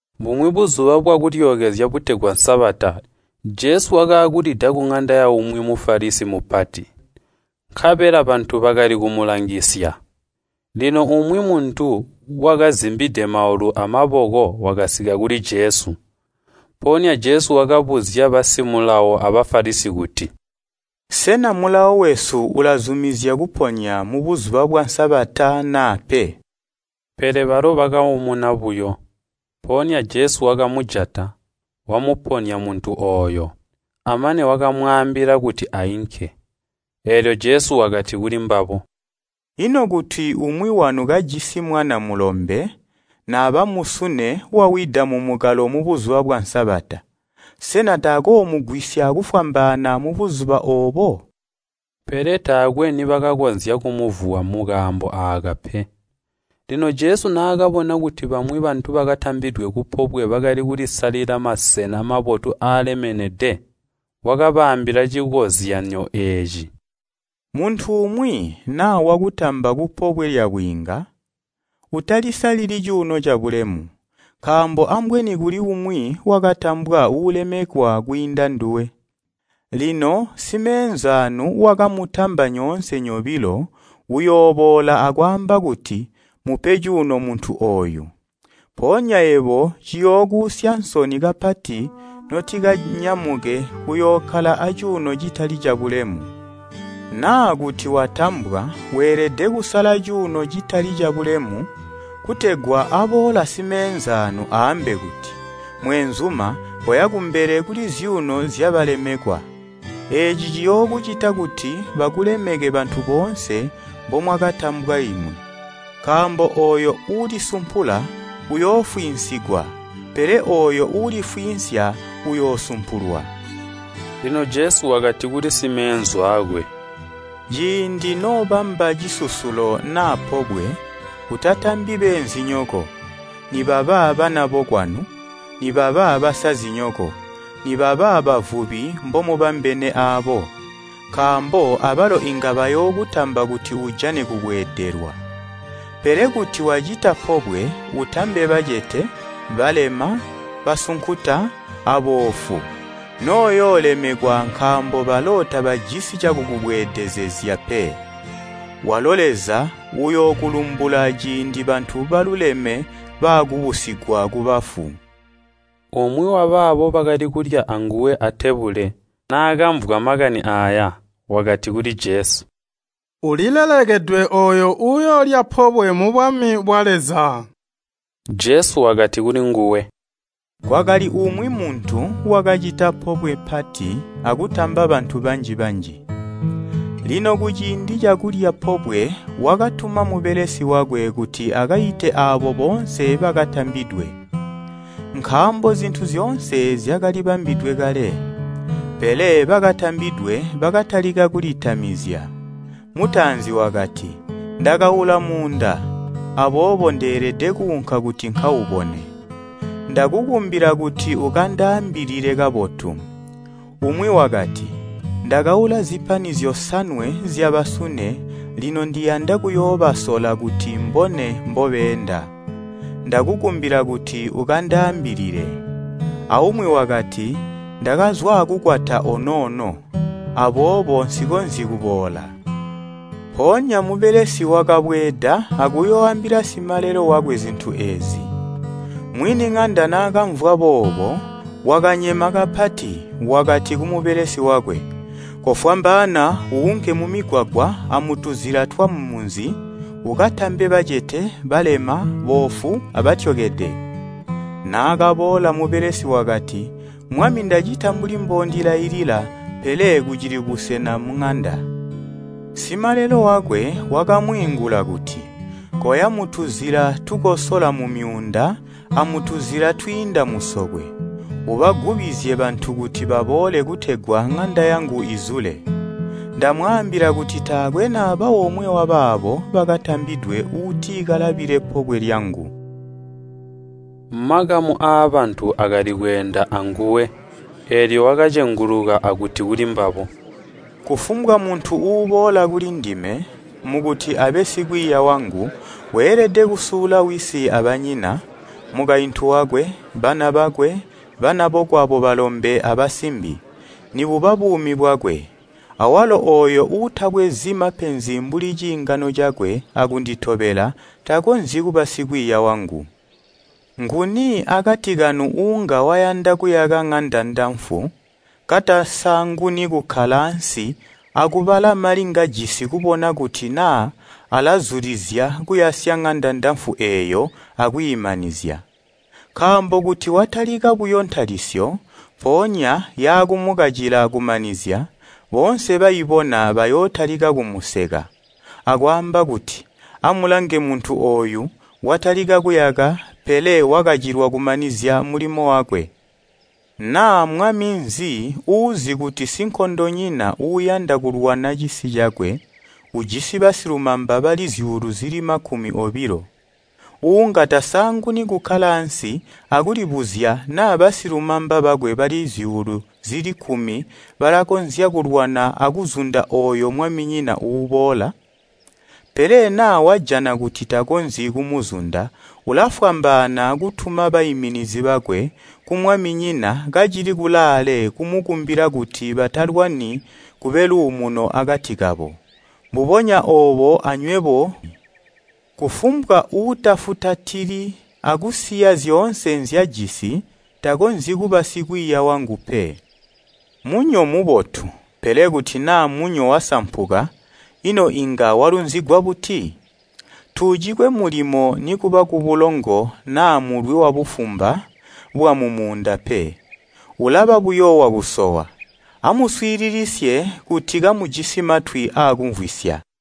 Bumwi Buzuba bwa Kulyookezya butegwa Sabata Jesu wakaakulida kuŋanda yaumwi Mufalisi mupati, nkabela bantu bakali kumulangisya. Lino umwi muntu wakazimbide maulu amaboko wakasika kuli Jesu. Mpoonya Jesu wakabuzya bamaiyi ba Mulawo a Bafalisi kuti, “Sena mulawo wesu ulazumizya kuponya mubuzuba bwa Sabata naa pe?” Pele balo bakaumuna buyo. Mpoonya Jesu wakamujata, wamuponya muntu ooyo, amane wakamwaambila kuti ainke. Eelyo Jesu wakati kulimbabo, “Ino kuti umwi wanu kajisi mwana mulombe naba musune wawida mumukalo mu Buzuba bwa Sabata, sena takoomugwisya kufwambaana mubuzuba oobo?” Pele taakwe nibakakonzya kumuvuwa mukaambo aaka pe. Lino Jesu naakabona kuti bamwi bantu bakatambidwe kupobwe bakali kulisalila masena mabotu aalemenede, wakabaambila cikozyanyo eeci. “Muntu umwi naa wakutamba kupobwe lyabwiinga, utalisalili cuuno cabulemu, nkaambo ambweni kuli umwi wakatambwa uulemekwa kwiinda nduwe. Lino simeenzaanu wakamutamba nyoonse nyobilo uyooboola akwaamba kuti ‘Mupe cuuno muntu ooyu.’ Mpoonya yebo ciyookuusya nsoni kapati notikanyamuke kuyookkala acuuno citali cabulemu. Naa kuti watambwa, weelede kusala cuuno citali cabulemu kutegwa aboola simeenzaanu aambe kuti, ‘Mweenzuma, koya kumbele kuli zyuuno zyabalemekwa.’ Eeci ciyookucita kuti bakulemeke bantu boonse mbomwakatambwa limwi. Nkaambo ooyo uulisumpula uyoofwiinsigwa, pele ooyo uulifwiinsya uyoosumpulwa.” Lino Jesu wakati kuli simeenzu aakwe, “Ciindi noobamba cisusulo naa pobwe, utatambi beenzinyoko, nibaba banabokwanu, nibaba basazinyoko, nibaba bavubi mbomubambene aabo, nkaambo abalo inga bayookutamba kuti ujane kubweedelwa. Pele kuti wacita pobwe, utambe bacete, balema, basunkuta, aboofu, noyoolemekwa nkaambo balo tabajisi cakukubweedezezya pe. Walo Leza uyookulumbula ciindi bantu babotu baakubusigwa kubafu.” Umwi wabaabo bakali kulya anguwe atebule, naakamvwa makani aaya, wakati kuli Jesu, “Ulilelekedwe ooyo uuyoolya pobwe mubwami bwa Leza!” Jesu wakati kulinguwe, “Kwakali umwi muntu wakacita pobwe pati akutamba bantu banji-banji. Lino kuciindi cakulya pobwe wakatuma mubelesi wakwe kuti akaite aabo boonse bakatambidwe, nkaambo zintu zyoonse zyakali bambidwe kale. Pele bakatambidwe bakatalika kulitamizya. Mutaanzi wakati, ‘Ndakaula muunda, aboobo ndeelede kuunka kuti nkaubone. Ndakukumbila kuti ukandaambilile kabotu.’ Umwi wakati, ‘Ndakaula zipani zyosanwe zyabasune lino ndiyanda kuyoobasola kuti mbone mbobeenda. Ndakukumbila kuti ukandaambilile.’ Aumwi wakati, ‘Ndakazwa akukwata onoono, aboobo nsikonzyi kuboola.’ “Mpoonya mubelesi wakabweeda akuyooambila simalelo wakwe zintu eezi. Mwini ŋanda naakamvwa boobo wakanyema kapati, wakati kumubelesi wakwe, ‘Kofwambaana uunke mumigwagwa amutuzila twamumunzi, ukatambe bacete, balema, boofu, abatyokede.’ Naakaboola mubelesi wakati, ‘Mwami ndacita mbuli mboondilailila, pele kucili busena muŋanda.’ Simalelo wakwe wakamwiingula kuti, ‘Koya mutuzila tukosola mumyuunda amutuzila twiinda musokwe, ubagubizye bantu kuti baboole kutegwa ŋanda yangu izule.’ Ndamwaambila kuti taakwe naba omwe wabaabo bakatambidwe uuti kalabile pobwe lyangu!” Makamu aabantu akali kweenda anguwe, eelyo wakacenguluka akuti kulimbabo, “Kufumbwa muntu uboola kulindime, mukuti abe sikwiiya wangu, weelede kundiyandisya kwiinda mbwayanda wisi, banyina, mukaintu wakwe, bana bakwe, banabokwabo balombe abasimbi, nibuba buumi bwakwe. Awalo ooyo uutabwezi mapenzi mbuli ciingano cakwe akunditobela, takonzyi kuba sikwiiya wangu. Nguni akati kanu uunga wayanda kuyaka ŋanda ndafu, katasaanguni kukkala ansi akubala mali ngajisi kubona kuti naa alazulizya kuyasya ŋanda ndafu eeyo akwiimanizya. Nkaambo kuti watalika buyo ntalisyo, mpoonya yaakumukacila kumanizya, boonse baibona bayootalika kumuseka, akwaamba kuti, ‘Amulange muntu ooyu, watalika kuyaka, pele wakacilwa kumanizya mulimo wakwe!’ Naa mwami nzi uuzi kuti sinkondonyina uuyanda kulwana cisi cakwe, ujisi basilumamba bali zyuulu zili makumi obilo, uunga tasaanguni kukkala ansi akulibuzya naa basilumamba bakwe bali zyuulu zili kkumi balakonzya kulwana akuzunda ooyo mwaminyina uuboola? “Pele naa wajana kuti takonzyi kumuzunda, ulafwambaana kutuma baiminizi bakwe kumwaminyina kacili kulaale kumukumbila kuti batalwani kube luumuno akati kabo. Mbubonya oobo anywebo kufumbwa uutafutatali akusiya zyoonse nzyajisi, takonzyi kuba sikwiiya wangu pe. “Munyo mubotu, pele kuti naa munyo wasampuka, ino inga walunzigwa buti? Tuucikwe mulimo nikuba kubulongo naa mulwi wabufumba bwamumunda pe, ulaba buyo wakusowa. Amuswiilisisye, kuti kamujisi matwi aakumvwisya!”